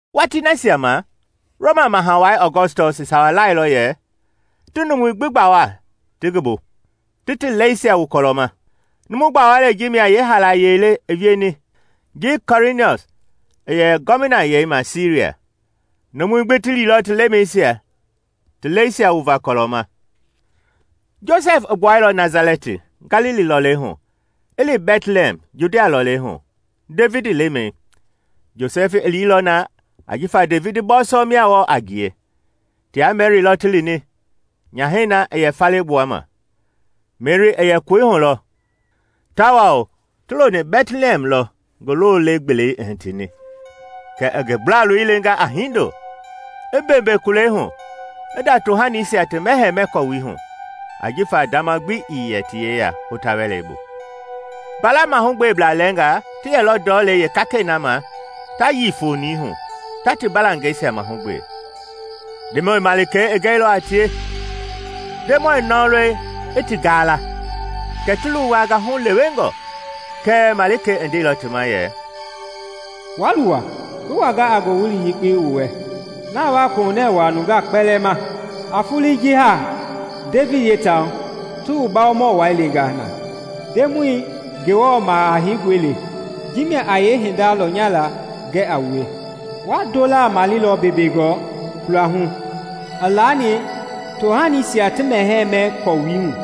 Watii nasia ma, Roma Maha Wai Ɔgɔstɔs i sawa lailɔ yɛ ti numui gbi gbawa ti ngi bu, ti ti lɛisia wu kɔlɔ ma. Numu gbawalei ji mia yeehaalaye le i wieni ji Kuiriniɔs i yɛ Gɔvinayei ma Siria. Numui gbi ti liilɔ ti lemɛisia ti lɛisia wuvaa kɔlɔ ma. Josɛf i gbuɛilɔ Nasalɛti, Galili lɔlei hu, i li Bɛtlihɛm, Judia lɔɔlɛi hu, Devidi lemɛi. Josɛfi i liilɔ na ajifa Devidi bɔɔsɔ mia wɔɔ a ngie. Tia Meri lɔ ti lini, nyahɛi na i yɛ faale gbuama. Meri i yɛ koi hu lɔ, tawao ti loni Bɛtlihɛm lɔ ngi lole-gbelei i hitini. Kɛ i ngi gblaloi lenga a hindo, i mbeembee kulei hu, i nda tohanisia ti mɛhɛɛ-mɛ-kɔwui hu ajifa ndama gbi ii yɛ ti yeya hota-wɛlei bu. Mbala mahugbeblaa lɛɛnga ti yɛlɔ ndɔlei yeekakɛi na ma ta yii fonii hu, ta ti mbalangɛisia mahugbe. Ndemɔi malikei i gɛilɔ a tie, Ndemɔi nɔlɔi i ti gaala, kɛ ti luwanga hulewengɔ. Kɛɛ malikei i ndeilɔ ti ma yɛ, “Wa luwa! Ngi wanga a ngowili yekpe wu wɛ, na a wa a kohunɛ wua nungaa kpɛlɛɛ ma. A foloi ji haa, Devidi yeetaahu, ti wu Bawomɔi lenga na Ndemɔi Ngewɔ Maha Heingɔi le! Ji mia a yee hindei lɔnyala gɛ a wue: wa ndolaa maleilɔ mbeembeengɔ kulehu, i laani tohanisia ti mɛhɛɛ-mɛ-kɔwui hu.”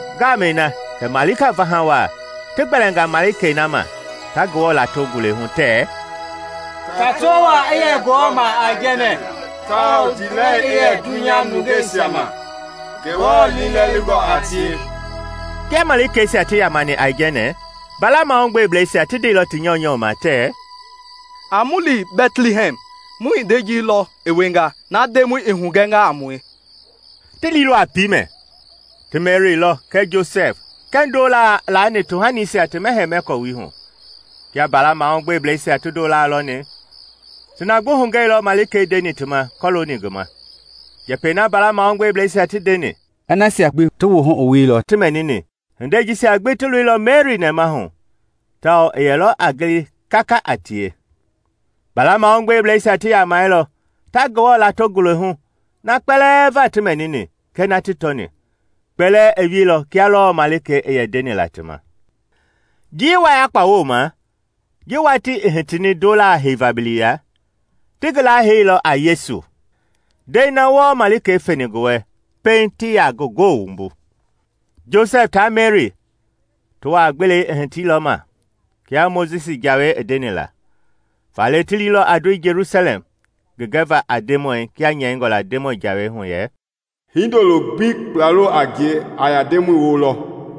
Ngamɛi na kɛ malika vaha waa ti gbɛɛnga malikei na ma, ta Ngewɔ lato ngule hu tɛɛ, “Tato waa i ye Ngewɔ ma aijɛnɛ tawao ndiilɛli i yɛ dunya nungei nasia ma Ngewɔ liilɛlingɔ a tie!” Kia malikeisia ti yamani aijɛnɛ, mbala mahugbebleisia ti ndeilɔ ti nyɔunyɔ ma tɛɛ, “A mu li Bɛtlihɛm mu hindei ji lɔ i wienga, na Ndemɔi i hugɛnga a mue.” Ti liilɔ a piimɛ, ti Meri lɔ kɛɛ Josɛf kɛɛ ndolaa i laani tohanisia ti mɛhɛɛ mɛ kɔwui hu. Kia mbala mahugbebleisia ti ndolaa lɔni, ti na gbi hugɛilɔ malikei ndeni ti ma kɔlooni ngi ma. Njɛpɛi na mbala mahugbebleisia ti ndeni, i nasia gbi wuhu wuilɔ ti mɛnini. Hindei jisia gbi ti loilɔ Meri nɛmahu tawao i yɛlɔ a gili kaka a tie. Mbala mahugbebleisia ti yamailɔ, ta Ngewɔ lato ngule hu na kpɛlɛɛ va ti mɛnini kɛɛ na ti tɔni; kpɛlɛɛ i wieilɔ kia lɔɔ malikei i yɛ ndeni la ti ma. Njii wayakpa wooma, ji watii i hitini ndolaa heiva biliya, ti ngi laa heilɔ a Yesu, ndɛi na wɔɔ malikei feni ngi wɛ pɛiŋ ti ya ngi goo wumbu. Josɛf tia Meri ti wua-gbelei i hitilɔ ma, kia Mojisi jawei i ndenila. Faale ti liilɔ a ndoi Jelusalɛm ngi gɛva a Ndemɔi, kia nyɛingɔ la Ndemɔi jawei hu yɛ, “Hindolo gbi kplalo a ngie a yɛ a Ndemɔi woo lɔ.”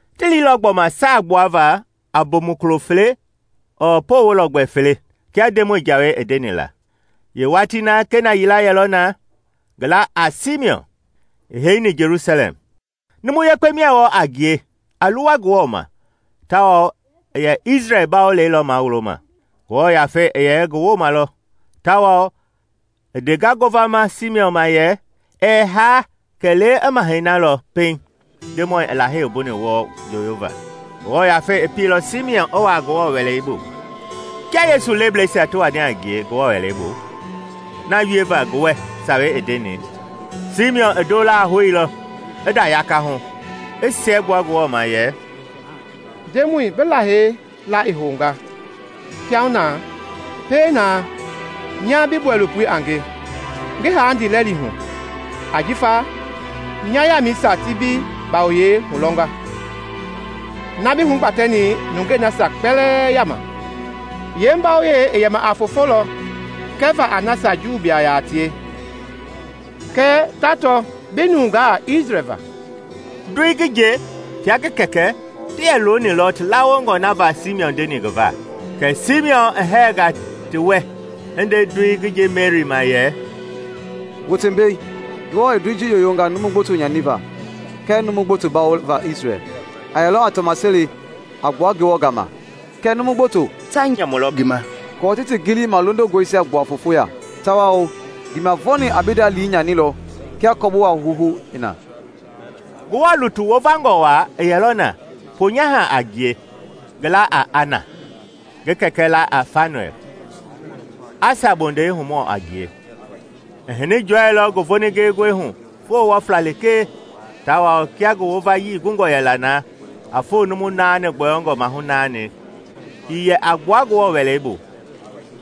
Ti liilɔ gbɔma saa gbuava a bomukulo fele ɔɔ poowo lɔgbɛ fele, kia Ndemɔi jawei i ndenila. Yee watii na kena yila yɛlɔ na, ngi la a Simiɔn, i heini Jelusalɛm. Numu yekpe mia wɔɔ a ngie a luwa Ngewɔ ma, tawao i yɛ Isrɛl Bawolei lɔ mawuloma. Ngewɔ Yafei i yɛ ngi wooma lɔ; tawao i ndenga ngovama Simiɔn ma yɛ, ɛɛ haa kɛlee i Mahɛi na lɔ pɛiŋ Ndemɔi i lahei wumbuni wɔɔ njooyova. Ngewɔ Yafei i pieilɔ Simiɔn i wua Ngewɔ Wɛlei bu. Kia Yesu lebleisia ti wani a ngie Ngewɔ Wɛlei bu na wieva ngi wɛ sawei i ndeni, Simiɔn i ndolaa houilɔ, i nda yakahu, i siɛgbua Ngewɔ ma yɛ, “Ndemɔi, bi lahei la i houga kiahuna, pie na nya bi bɔilopoi a nge ngi haa ndiilɛli hu. Ajifa nya yamɛisia ti bi bawoyɛi lɔnga na bi hugbatɛni nungeisia kpɛlɛɛ yama. Yeembawoyei i yɛma a fofo lɔ gɛva a nasia Juublaa yaa tie kɛɛ tato bi nungaa Isrɛl va.” Ndoi ngi nje tia ngi kɛkɛ ti yɛ lonilɔ ti lawongɔ na va Simiɔn ndeni ngi va; kɛ Simiɔn i hɛɛnga ti wɛ, i nde ndoi ngi nje Meri ma yɛ, “Wote mbei, Ngewɔ i ndoi ji yoyonga numu gboto nyaniva kɛɛ numu gboto bawova Isrɛl. A yɛlɔ a tɔmaseli a gbua Ngewɔ gama, kɛɛ numu gboto ta njia nyamu lelɔ ngi ma aako ti ti gili malondongɔisia gbua foofo ya. Tawao ndiimavɔɔni a bi nda lii nyanilɔ kia kɔbowa houhou i na.” Ngewɔ lutui wovangɔ waa i yɛlɔ na, ponyaha a ngie, ngi laa a Ana, ngi kɛkɛ la a Fanuɛl, Asa bondei humɔ a ngie. I hini jɔɛilɔ ngi voningengɔi hu foo wɔfla lekee tawao kia ngi wovayii gungɔ yɛla na a foo numu naani gbɔyɔngɔ mahu naani, Ii yɛ a gbua Ngewɔ Wɛlei bu;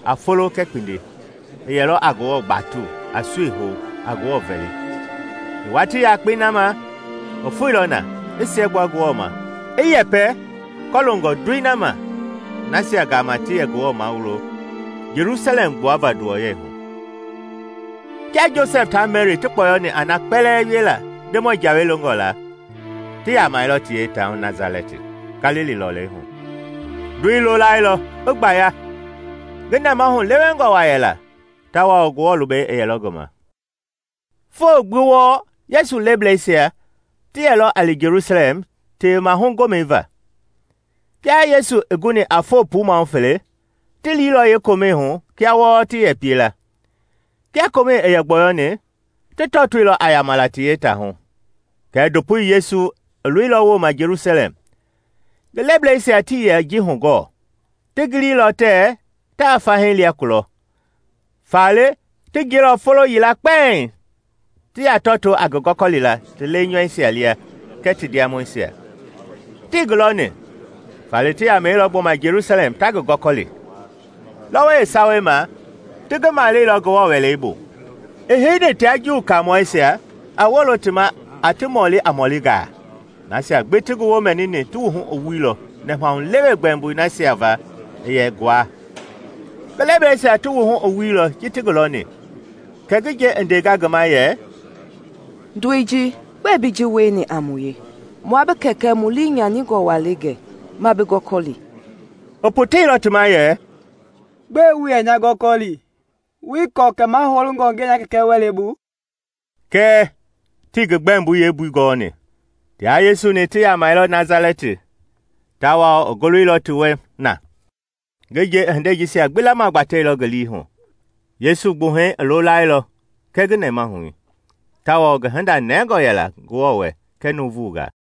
a folo kɛɛ kpindi, i yɛlɔ a Ngewɔ batu, a sui hou, a Ngewɔ vɛli. Yeewatii yakpei na ma, i foeilɔ na, i siɛgbua Ngewɔ ma, i yɛpɛ kɔloongɔ ndoi ma nasia gama ti yɛ Ngewɔ mawulo Jelusalɛm gbuava nduwɔyɛi hu. Kia Josɛf ta Meri ti kpɔyɔni a na kpɛlɛɛ wiela Ndemɔi jawei longɔ la, ti yamailɔ ti yeetaahu, Nasalɛti, Galili lɔlei hu. Ndoi loolailɔ, i gbaya; ngi nɛmahu lewengɔ waa yɛla, tawao Ngewɔ lubɛi i yɛlɔ ngi ma. Foo gbi wɔɔ Yesu lebleisia ti yɛlɔ a li Jelusalɛm Tewemahu Gomɛi va. Kia Yesu i guni a foo puu mahu fele, ti liilɔ yee komɛi hu kia wɔɔ ti yɛ piela. Kia komɛi i gbɔyɔni, ti tɔtoilɔ a yama la ti yeetaahu, kɛɛ ndopoi Yesu i loilɔ wooma Jelusalɛm. Ngi lebleisia tii yɛ ji hugɔɔ; ti giliilɔ tɛɛ ta fahii lia kulɔ, faale ti jiɛilɔ folo yila kpɛiŋ ti ya tɔtoo a ngi gɔkɔlila ti leinyɔuisia lia kɛɛ ti ndiamɔisia. Tii ngi lɔni, faale ti yamailɔ gbɔma Jelusalɛm ta ngi gɔkɔli. Lɔwɔi yeesawei ma ti ngi maleilɔ Ngewɔ Wɛlei bu, i heini tia Juuwu kaamɔisia, a wolo ti ma a ti mɔli a mɔɔlingaa. Nasia gbi ti ngi woo mɛnini ti wuhu i wuilɔ nɛmahulewe gbɛmboi nasia va i yɛ nguaa. Ngi lebleisia ti wuhu i wuilɔ ji ti ngi lɔni, kɛ ngi nje i ndenga ngi ma yɛ, “Ndoi ji, gbɛe bi ji wieni a mue? Mua bi kɛkɛ mu lii nyaningɔ wa le gɛ, ma bi gɔkɔli.” I poteilɔ ti ma yɛ, “Gbɛe wu yɛ nya gɔkɔli? Wuii kɔɔ kɛ mahoungɔ ngi yɛ nya Kɛkɛ wɛlei bu?” Kɛɛ, tii ngi gbɛmboi yeembui gɔni. Tia Yesu-ni ti yamailɔ Nasalɛti, tawao i gooloilɔ ti wɛ na. Ngi nje i hindei jisia gbi lamagbatɛilɔ ngi lii hu. Yesu gbuhɛi i loolailɔ kɛɛ ngi nɛmahui, tawao ngi hinda nɛngɔ yɛla Ngewɔ wɛ kɛɛ nuuvungaa.